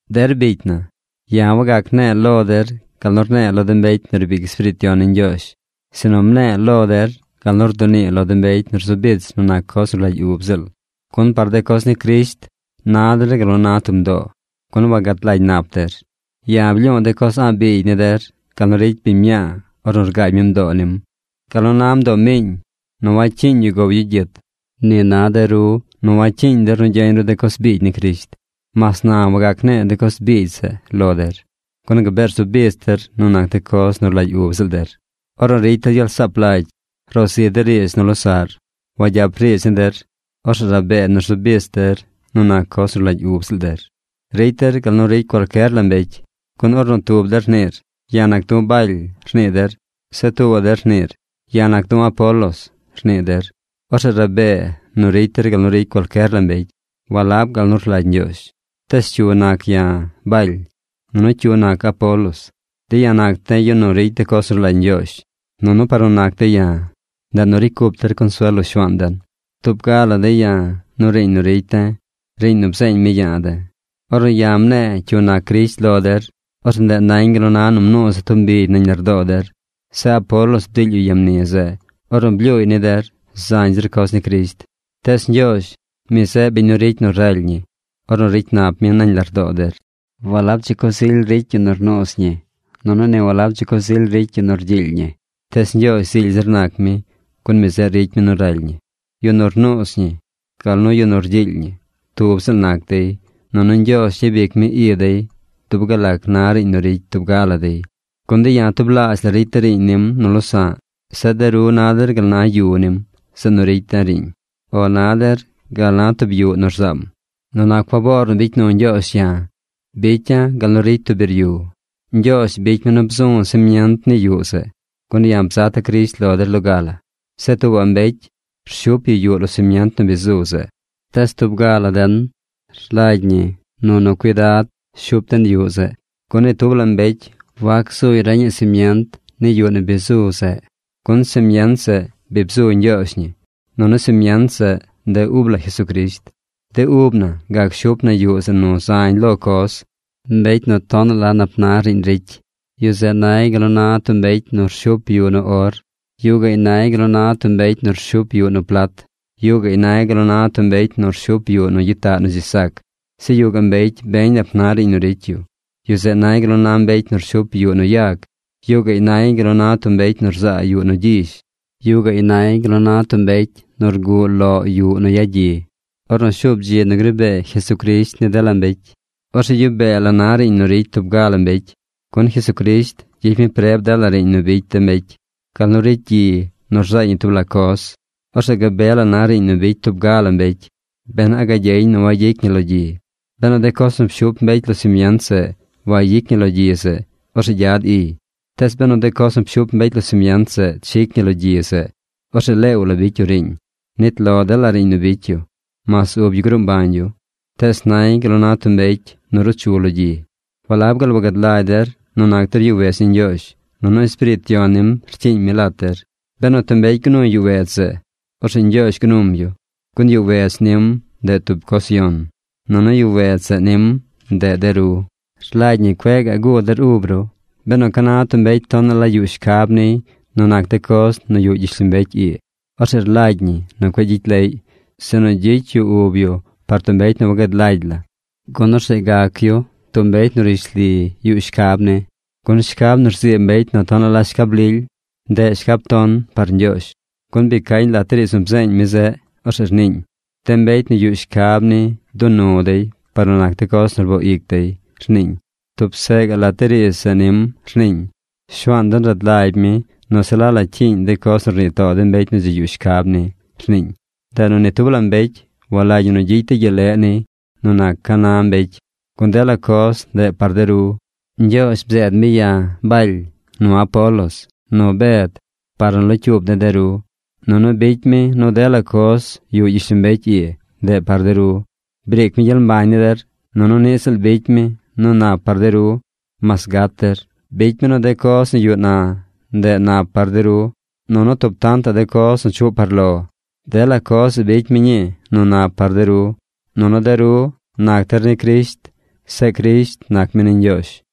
Der bicy na, ya̱ wangac ne̱e̱ lo der gal nu rne̱e̱ lo de mbecy nu riib ic Espiriit Yon ni Ñgyoozh, sinu mne̱e̱ lo der gal nu rdunii lo de mbecy nu rzu bich nu nac coz nu rlagy ub ziꞌl. Gun par de coz ni Crisht, na der gal nu na tub mdoo, gun wagad lagy nap der. Ya̱ blyu̱u̱ de coz a̱ꞌ biigy ni der gal nu ricy biñ mñaa ornu rgaagy mi mdoo nim. Gal nu na mdoo miiñ nu wacyiiñ yu gow yu gyit, ni na de ru nu wacyiiñ der nu gyeñ ru de coz biigy ni Crisht. Mas na wagac ne̱e̱ de coz biigy zeꞌ lo der. Gun gabee rzu bich der nu nac de coz nu rlagy ub ziꞌl der. Ornu ricy der gyel saap lagy, ro zi der riidz nu losaꞌr. Wagyap riidz ni der. Orzeꞌ rabee nu rzu bich der nu nac coz nu rlagy ub ziꞌl der. Ricy der gal nu ricy cualcyer la mbecy. Gun ornu tub der rniir: “Ya̱ nac du̱ Baly”, rnii der. Zeꞌ tuubaꞌ der rniir: “Ya̱ nac du̱ Apolos”, rnii der. Orzeꞌ rabee nu ricy der gal nu ricy cualcyer la mbecy, walab gal nu rlagy Ñgyoozh. Tees ¿cyu nac ya̱, Baly? Nunu ¿cyu nac Apolos? De̱ ya̱ nac de̱ yu nu ricy de coz nu rlagy Ñgyoozh. Nunu par nu nac de̱ ya̱, ndeꞌ nu ricy cup der consuel lo Shuaan den. Tub ga la de̱ ya̱ nu riiñ nu ricy de̱, riiñ nu bzeeñ mi ya̱a̱ de̱. Ornu ya̱ mne̱e̱ cyu nac Crisht lo der, orzeꞌ ndeꞌ nañ gal na nu mnuuza̱ tub mbigy nañ lardoo der. Zeꞌ Apolos bdiily yu ya mni zeꞌ ornu blyuuy ni der zañ zir coz ni Crisht. Tees Ñgyoozh, mi zeꞌ biñ nu ricy nu raly ñi ornu ricy nap mi nañ lardoo der. Walab dzi coz ily nac yu nu rnuuz ñi, nunu niꞌ walab dzi coz ily nac yu nu rgyiily ñi. Tees Ñgyoozh zily zir nac mi, gun mi zeꞌ ricy mi nu raly ñi. Yu nu rnuuz ñi, gal nu yu nu rgyiily ñi, tub ziꞌl nac dey, nunu Ñgyoozh gyabic mi i dey dub gal lac na riiñ nu ricy tub ga la dey. Gun de̱ ya̱ tublaazh la ricy de̱ riiñ nim nu losa̱ꞌ. Zeꞌ de ru na der gal na yu nim, zeꞌ nu ricy de̱ riiñ. O na der gal na tub yuꞌ nu rzaam. Nu nac faboor nu bicy nu Ñgyoozh ya̱, bicya̱ gal nu ricy tub biryu. Ñgyoozh bicy mi nu bzu̱ simient ni yuꞌ zeꞌ, gun ya̱ bzata̱ Crisht lo der loga la. Zeꞌ tuubaꞌ mbecy rshup yu yuꞌ lo simient nu bi zu zeꞌ. Tees tub ga la den rlagy ñi nu nu cuidad shup den yuꞌ zeꞌ. Gun ni tub la mbecy wac gzuy reñaꞌ simient ni yuꞌ nu bi zu zeꞌ, gun simient zeꞌ bi bzu Ñgyoozh ñi, nunu simient zeꞌ, ndeꞌ ub la Jesucrisht. De ub na gac shup na yuꞌ zeꞌ nu zañ lo coz. Mbecy nu tonaꞌ la nap na riiñ ricy, yu zeꞌ nay gal nu na tub mbecy nu shup yuꞌ nu or. Yuꞌ gaꞌy nay gal nu na tub mbecy nu rshup yuꞌ nu plat. Yuꞌ gaꞌy nay gal nu na tub mbecy nu rshup yuꞌ nu gyitaꞌ nu dzi sac. Zeꞌ yuꞌ gaꞌ mbecy beñ nap na riiñ nu ricy yu. Yu zeꞌ nay gal nu na mbecy nu rshup yuꞌ nu yag. Yuꞌ gaꞌy nay gal nu na tub mbecy nu rzaa yuꞌ nu gyizh. Yuꞌ gaꞌy nay gal nu na tub mbecy nu rguꞌ loꞌ yuꞌ nu yagyi. Ornu shuub dzi nu gri bee Jesucrisht ni dela mbecy, orzeꞌ gyuꞌ bee la na riiñ nu ricy tub ga la mbecy. Gun Jesucrisht gyicy mi preb dela riiñ nu bicy de mbecy, gal nu ricy gyi nu rzaay ñi tub la coz. Orzeꞌ gabe la na riiñ nu bicy tub ga la mbecy, ben a gagyeñ nu wayic ñi lo gyi. Benu de coz nu pshup mbecy lo simient zeꞌ wayic ñi lo gyi zeꞌ, orzeꞌ gyad iy. Tees benu de coz nu pshup mbecy lo simient zeꞌ chic ñi lo gyi zeꞌ, orzeꞌ leew la bicy yu riiñ. Nit lo dela riiñ nu bicy yu, mas ub yu gruu mbañ yu. Tees nay gal na tub mbecy nu ruu chu lo gyi. ¿Walab gaal wagad lagy der nu nac der yuꞌ wedz ni Ñgyoozh, nunu Espiriit Yon nim rcyiiñ mi lat der? Benu tub mbecy gnuy yuꞌ wedz zeꞌ, orzeꞌ Ñgyoozh gnum yu, gun yuꞌ wedz nim ndeꞌ tub coz yon, nunu yuꞌ wedz zeꞌ nim, ndeꞌ de ru. Rlagy ñi nu cueꞌ gaꞌ guu der ub ru. Benu ca na tub mbecy tonaꞌ la yuꞌ shcab niy nu nac de coz nu yuꞌ gyishlombecy ii, orzeꞌ rlagy ñi nu cueꞌ gyicy leꞌy, sinu gyicy yu ub yu par tub mbecy nu wagad lagy la, gun orzeꞌ gac yu tub mbecy nu rishli yuꞌ shcab ni. Gun shcab nu rzii mbecy nu tonaꞌ la shcab lily, ndeꞌ shcab ton par Ñgyoozh. Gun bi cañ lat de riidz nu bzeeñ mi zeꞌ. Orzeꞌ rniiñ: “De mbecy nu yuꞌ shcab ni dunu dey par nu nac de coz nu rboo ic dey”, rniiñ. Tub seꞌ gaꞌ lat de riidz zeꞌ nim rniiñ: “Shuaan den rad lagy mi nu se la la cyiiñ de coz nu rnii too de mbecy nu dzi yuꞌ shcab ni”, rniiñ. Ndeꞌ nu ni tub la mbecy walagy ñi nu gyicy dey gyel leꞌ niy nu nac ca na mbecy, gun dela coz ndeꞌ par de ru. Ñgyoozh bzeed mi ya̱, Baly, nu Apolos, nu Bed par nu locyuub de̱ der. Nunu bicy mi nu dela coz nu yuꞌ gyishlombecy ii ndeꞌ par de ru. Briic mi gyel mbañ ni der, nunu niꞌ ziꞌl bicy mi nu nap par de ru mas gat der. Bicy mi nu de coz nu yuꞌ na ndeꞌ nap par de ru, nunu tub tantaꞌ de coz nu chuꞌ par lo. Dela coz zeꞌ bicy mi ñii nu nap par de ru. Nunu de ru nac der ni Crisht. Zeꞌ Crisht nac mi ni Ñgyoozh.